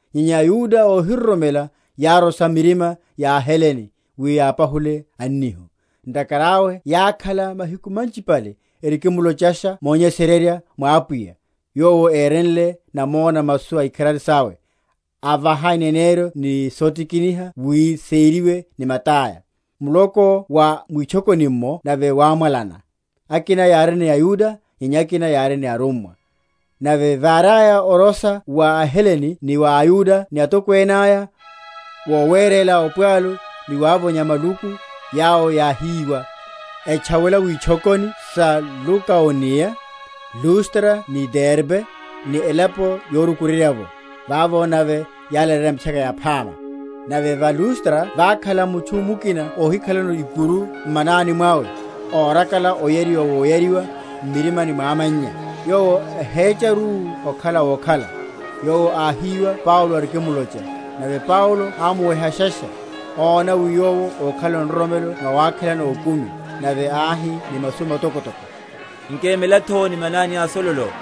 Nyenya aYuda óhiroromela yárosha mirima ya aHelene wi yapahule annihu. Ntakhara awe yákhala mahiku manchipale erikimlochasha monyesererya mwa Apwiya, yowo érenle namona masu aikharari sawe, avaha ineneryo ni sotikiniha wi seriwe ni mata’ya. Muloko wa mwitchokoni’mmo nave wámwalana; akina yári ni aYuda, nyenya akina yári ni arummwa. Nave váriaya orosha wa aHelene ni wa aYuda ni atokwene aya, wowerela opwalu ni wavonya maluku, yawo yáhíwa, etchawela witchokoni sa Lukaoniya, Lustra ni Derbe, ni elapo yorukuryerya’vo: vavo nave yálaleyerya Mitchaka Yaphama. Nave va Lustra vákhala mutchu mukina óhikhalano ikuru m’manani mwawe, órakala oyariwa woyariwa m’mirimani mwa amannya, yowo ahécharu okhala wokhala. Yowo áhíwa Paulo arikimlocha: nave Paulo ámuwehasha, óna wi yowo ákhalano nroromelo nawakhelano okumi, nave áhi ni masu matokotoko, Nkemela’tho ni mananiá sololo.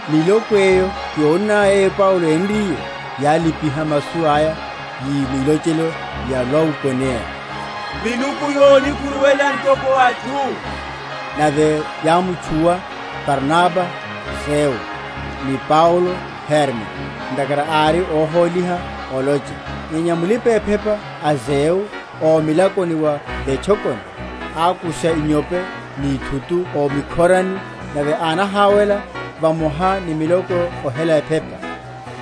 Miloko eyo yónnaya yeyo Paulo énriye, yálipiha masu aya, yi mwilochelo ya Lukaoniya, Miluku yonikhuruwela ntoko atchu. Nave yámutchuwa Barnaba, Zeu; ni Paulo, Herme, ntakhara ári óhóliha olocha. Nyenya mulipa‐ephepa a Zeu ómilakoni wa vetchokoni, ákusha inyope ni ithutu o mikhorani, nave ánahawela vamoha ni miloko ohela ephepa.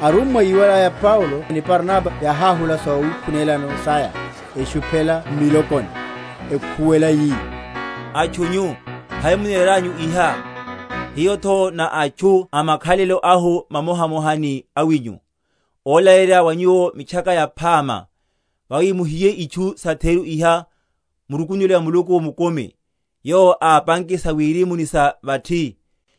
Arummwa yíwalaya Paulo ni Barnaba, yáháhula sawikhunela saya, eshuphela m’milokoni, ekhuwela yi, Atchu nyu, hai muneranyu iha? hiyo’tho ná atchu a makhalelo ahu mamohamoha ni awinyu, ólaleyerya wa nyuwo Mitchaka Yaphama, yawi muhiye itchu satheru iha, murukunuwele wa Muluku mukumi, yowo ápanke sa wirimu ni sa vathi,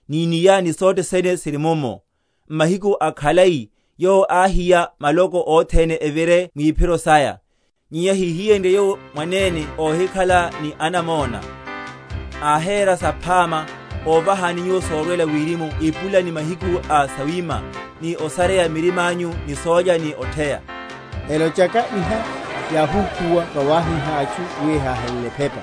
ni’nia, ni sothene siri mummo: m’mahiku akhalai Yowo áhiya maloko othene evire mwiphiro saya. Nyenya híhiyenrye Yowo mwanene óhikhala ni anamona, áhera saphama, óvahani nyuwo sorwela wirimu epula ni mahiku a sawima, ni osarya mirima’nyu ni sólya ni otheya. Elochaka iha, yáhukhuwa vawahíha atchu wi ehahelele ephepa.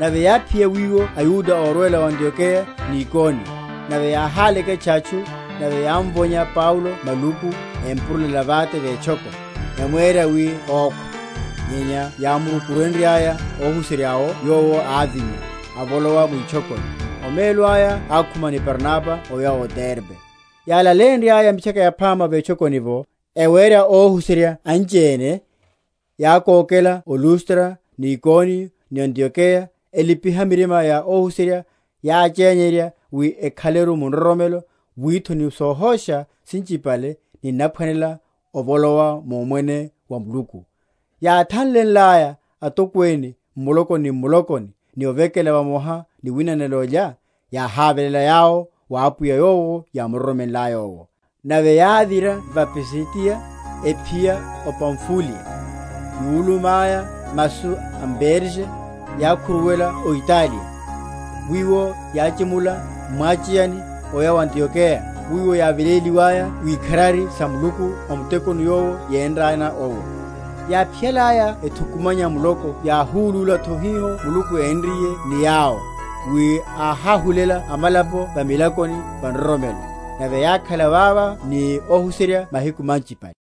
Nave yáphiya wiwo aYuda órwela o Antiokeya ni Ikoniyo: nave yáháleketcha atchu, nave yámvonya Paulo maluku, empurulela vate vetchoko; emwera wi okhwa. Nyenya yámurukurenryaya ohuserya’wo, yowo ávinya, avolowa mwitchokoni: omelo aya ákhuma ni Barnaba oya o Derbe. Yálaleyenryaya Mitchaka Yaphama vetchokoni’vo, ewéra óhuserya anchiene, yákókela o Lustra ni Ikoniyo ni Antiokeya, elipiha mirima ya óhuserya, yáchenyerya wi ekhaleru mu nroromelo, wi’tho ni sohosha sinchipale ninaphwanela ovolowa mu’mwene wa Muluku. Yáthanlelaya atokwene m’mulokoni ni m’mulokoni ni ovekela vamoha ni winanela olya, yáháveléla yawo wa Apwiya yowo yámuroromelaya owo. Nave yávira va Pisidiya, ephiya o Pamfuliya. Yúlummaya masu m’Perge, yákhuruwela o Ataliya; wiwo yáchimula m’mwacheyani oya o Antiokeya, wiwo yáveleliwaya wikharari sa Muluku o mutekoni yowo yénraya owo. Yáphiyalaya ethukumanya muloko yáhulúla’tho hiho Muluku énriye ni yawo, wi áháhulela amalapo va milakoni va nroromelo. Nave yákhala vavo ni óhuserya mahiku manchipale.